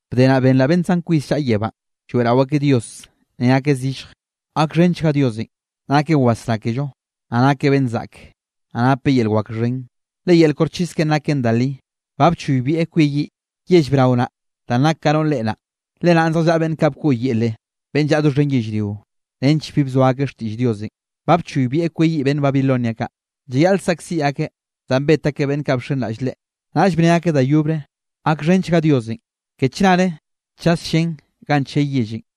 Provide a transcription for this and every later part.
Bde naꞌ benraꞌ beꞌnn zan kwis llaꞌa yebánꞌ, lloeꞌrao akeꞌ Dios, ne akeꞌ zillj: ¡Gakxhenchga Diosenꞌ! Nakeꞌ wasrá kello, naꞌ nakeꞌ beꞌnn zaꞌke, naꞌ napeꞌ yel wak xhen. Le yel koxchis keꞌen naken da li. Ba bchoybieꞌ kweyiꞌ yell brao naꞌ danꞌ nak ka to noꞌr reꞌe naꞌ, le naꞌn zjallaꞌa beꞌnn kaꞌ bkoꞌyele beꞌnn llaꞌa doxhen yellrio, nench bi bzoa akeꞌ xtiꞌll Diosenꞌ. Ba bchoybieꞌ kweyiꞌ beꞌnn Babilonia kaꞌ, llayaꞌl saꞌkziꞌ akeꞌ danꞌ bet akeꞌ beꞌnn kaꞌ bxenraꞌll Leꞌe. Naꞌll bne akeꞌ da yobre: —¡Gakxhenchga Diosenꞌ! Ke chnare chas llén ganꞌ chey yellenꞌ.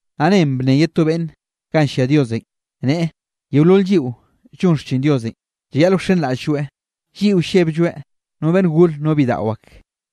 Naꞌ nen bnne ye to beꞌnn ganꞌ llia Diosenꞌ, neꞌe: Yeolol lliꞌo llon xchin Diosenꞌ llayaꞌl wxenraꞌll-lloeꞌ, lliꞌo lleblloeꞌ, no beꞌnn gore no bidaꞌo ak.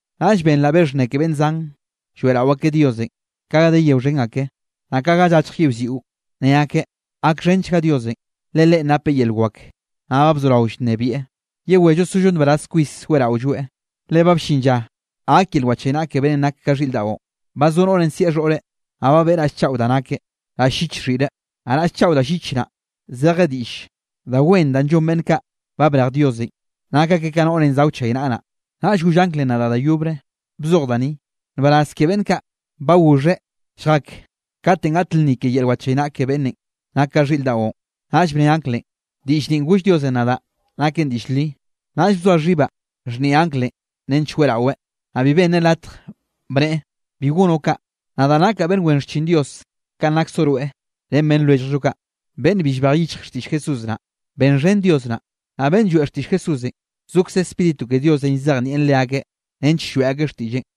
Naꞌll benraꞌ be xhnne ke beꞌnn zan lloeꞌrao akeꞌ Diosenꞌ, naꞌ nen ka ga de yeo xhen ake, naꞌ ka ga llachj yiꞌwziꞌo, ne akeꞌ: ¡Gakxhenchga Diosenꞌ! Le leꞌen napeꞌ yel wak, naꞌ ba bzorao llnebieꞌ. Yewello sollo nbaraz kwis weꞌraolloeꞌ. Le ba bllin lla gak yel wachaynaꞌa ke beꞌnnenꞌ nak ka xhiꞌr daꞌon. Ba zo noꞌrenꞌ sieꞌ xhoꞌreꞌ. Ba beꞌe raꞌll chaꞌo da nakeꞌ, raꞌll lliche xhiꞌre. Naꞌ raꞌll chaꞌo da llich naꞌ, zeje diꞌll da wen danꞌ llon beꞌnn kaꞌ ba brej Diosenꞌ, nak akeꞌ ka noꞌrenꞌ za wchaynaꞌa naꞌ. Naꞌll goll anglenꞌ nadaꞌ da yobre: —Bzoj da ni: “Nbaraz ke beꞌnn kaꞌ ba goxheꞌ lljak katenꞌ gak lnni ke yel wachaynaꞌa ke beꞌnnenꞌ nak ka xhiꞌr daꞌon.” Naꞌll bne anglenꞌ: —Diꞌll ninꞌ goll Diosenꞌ nadaꞌ naken diꞌll li. Naꞌll bzoa xhibaꞌ xhnieꞌ anglenꞌ nench weꞌraweꞌ, naꞌ bi benneꞌ latje, bneꞌe: —Bi gonoꞌ kaꞌ. Nadaꞌ nakaꞌ beꞌnn wen xchin Dios kanꞌ naksoꞌ rweꞌ ren beꞌnn lwelljoꞌ kaꞌ, beꞌnn bi llbej yichjeꞌ xtiꞌll Jesús naꞌ. Benxhen Dios naꞌ. Naꞌ beꞌnn lloeꞌ xtiꞌll Jesúsenꞌ, zokze Spíritu ke Diosenꞌ llzejnieꞌn leakeꞌ nench lloeꞌ akeꞌ xtiꞌlleꞌn.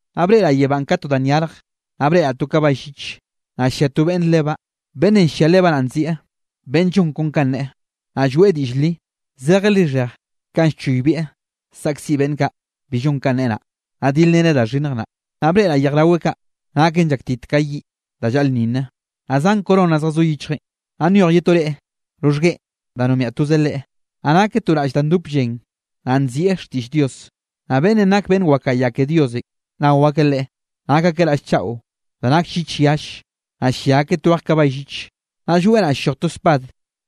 Naꞌ breꞌraꞌ yebánꞌ ka to da nyarje, naꞌ breꞌraꞌ to kabay lliche, naꞌ llia to beꞌnne lebaꞌ. Beꞌnnenꞌ llia lebaꞌn naꞌ nzieꞌ Beꞌnn Llon Kon Kanꞌ Neꞌe, naꞌ Lloeꞌ Diꞌll Li. Zejeꞌ lixheje kanꞌ llchoybieꞌ saꞌkziꞌ beꞌnn kaꞌ bi llon kanꞌ neꞌe naꞌ, naꞌ dilreneꞌ da xhinnj naꞌ. Naꞌ breꞌraꞌ yej raweꞌ kaꞌ naken llaktit ka yiꞌ da llaꞌlnninne, naꞌ zan corona zjazó yichjeꞌn, naꞌ nyoj ye to reꞌe roxhgueꞌen da nombiaꞌ toze Leꞌe. Naꞌ nakeꞌ to raꞌll da dop llen, naꞌ nzieꞌ Xtiꞌll Dios. Naꞌ beꞌnn nak beꞌnn wakaꞌa ya ke Diosenꞌ nao akeꞌ Leꞌe, nak akeꞌ raꞌll chaꞌo da nak llich yalle, naꞌ llia akeꞌ twej kabay lliche. Naꞌ lloeꞌ naꞌ ll-lloj to spad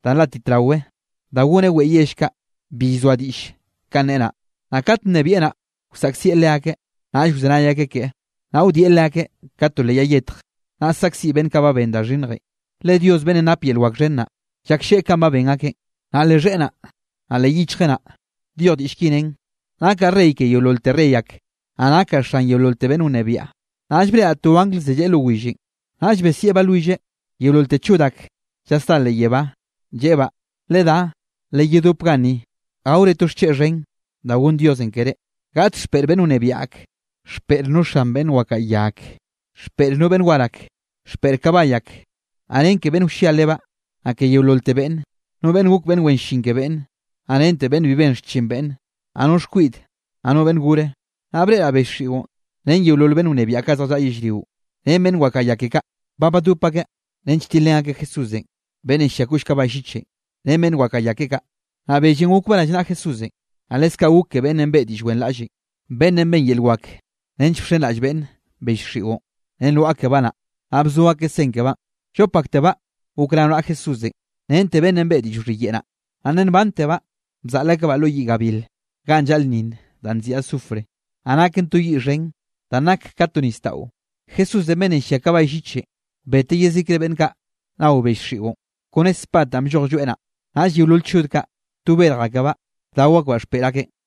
da nlátit raweꞌ da goneꞌ weꞌe yell kaꞌ bi llzoa diꞌll kanꞌ neꞌe naꞌ. Naꞌ kat nnebieꞌ naꞌ, wsaꞌkzieꞌ leakeꞌ, naꞌll wzenay akeꞌ keꞌe. Naꞌ wdieꞌ leakeꞌ ka to leꞌ yay yetj, naꞌ saꞌkziꞌ beꞌnn kaꞌ ba ben da xhinnjenꞌ, le Dios beꞌnnenꞌ nap yel wak xhen naꞌ, llaklleꞌe kanꞌ ba ben akeꞌn. Naꞌ leꞌ xheꞌe naꞌ, naꞌ leꞌ xhichjeꞌ naꞌ, nyoj diꞌll ki nen: “Nakaꞌ Rey ke yeololte rey ak, naꞌ nakaꞌ Xan yeololte beꞌnn wnebiaꞌ.” Naꞌll breꞌraꞌ to angl zelleꞌe lo willenꞌ, naꞌll besieꞌ balwilleꞌ yeololte chod ak llasdá leꞌ yebánꞌ, lleꞌebaꞌ: —Ledá, leyedope ganni gaore to xcheꞌ xhen da gonn Diosenꞌ keré. Gaꞌt xpeꞌr beꞌnn wnebiaꞌ ak, xpeꞌr no xan beꞌnn wakaꞌa ya ak, xpeꞌr no beꞌnn war ak, xpeꞌr kabay ak, naꞌ ren ke beꞌnn wllia lebaꞌ, naꞌ ke yeololte beꞌnne, no beꞌnn gok beꞌnn wen llin ke beꞌnne, naꞌ rente beꞌnn bi ben xchin beꞌnne, naꞌ no xkwiꞌde, naꞌ no beꞌnn gore. Naꞌ breꞌraꞌ bell xiꞌon, ren yeolol beꞌnn wnebiaꞌ kaꞌ zjallaꞌa yellrio ren beꞌnn wakaꞌa ya keꞌe kaꞌ, ba badop akeꞌ nench tilrén akeꞌ Jesús beꞌnnenꞌ llia koꞌll kabay llichenꞌ, ren beꞌnn wakaꞌa ya keꞌe kaꞌ. Naꞌ bellenꞌ gokbaꞌ rallnaꞌa Jesúsenꞌ, naꞌ leskaꞌ gok ke beꞌnnenꞌ beꞌe diꞌll wenraꞌllenꞌ, beꞌnnenꞌ ben yel wak nench bxenraꞌll beꞌnne bell xiꞌon, ren lwaꞌa kebaꞌ naꞌ, naꞌ bzo akeꞌ sen kebaꞌn. Llop aktebaꞌ gok rao naꞌa Jesúsenꞌ rente beꞌnnenꞌ beꞌe diꞌll wxhiyeꞌe naꞌ, nna nbantebaꞌ bzaꞌl akebaꞌ lo yiꞌ gabil ganꞌ llaꞌlnninn danꞌ nziꞌi azufre, naꞌ naken to yiꞌ xhen danꞌ nak ka to nisdaꞌo. Jesúsenꞌ beꞌnnenꞌ llia kabay llichenꞌ beteꞌ yezikre beꞌnn kaꞌ nao bell xiꞌon kone spad danꞌ blloj lloeꞌ naꞌ, naꞌll yeolol chod kaꞌ to berj akebaꞌ bdao akbaꞌ xpeꞌr akeꞌn.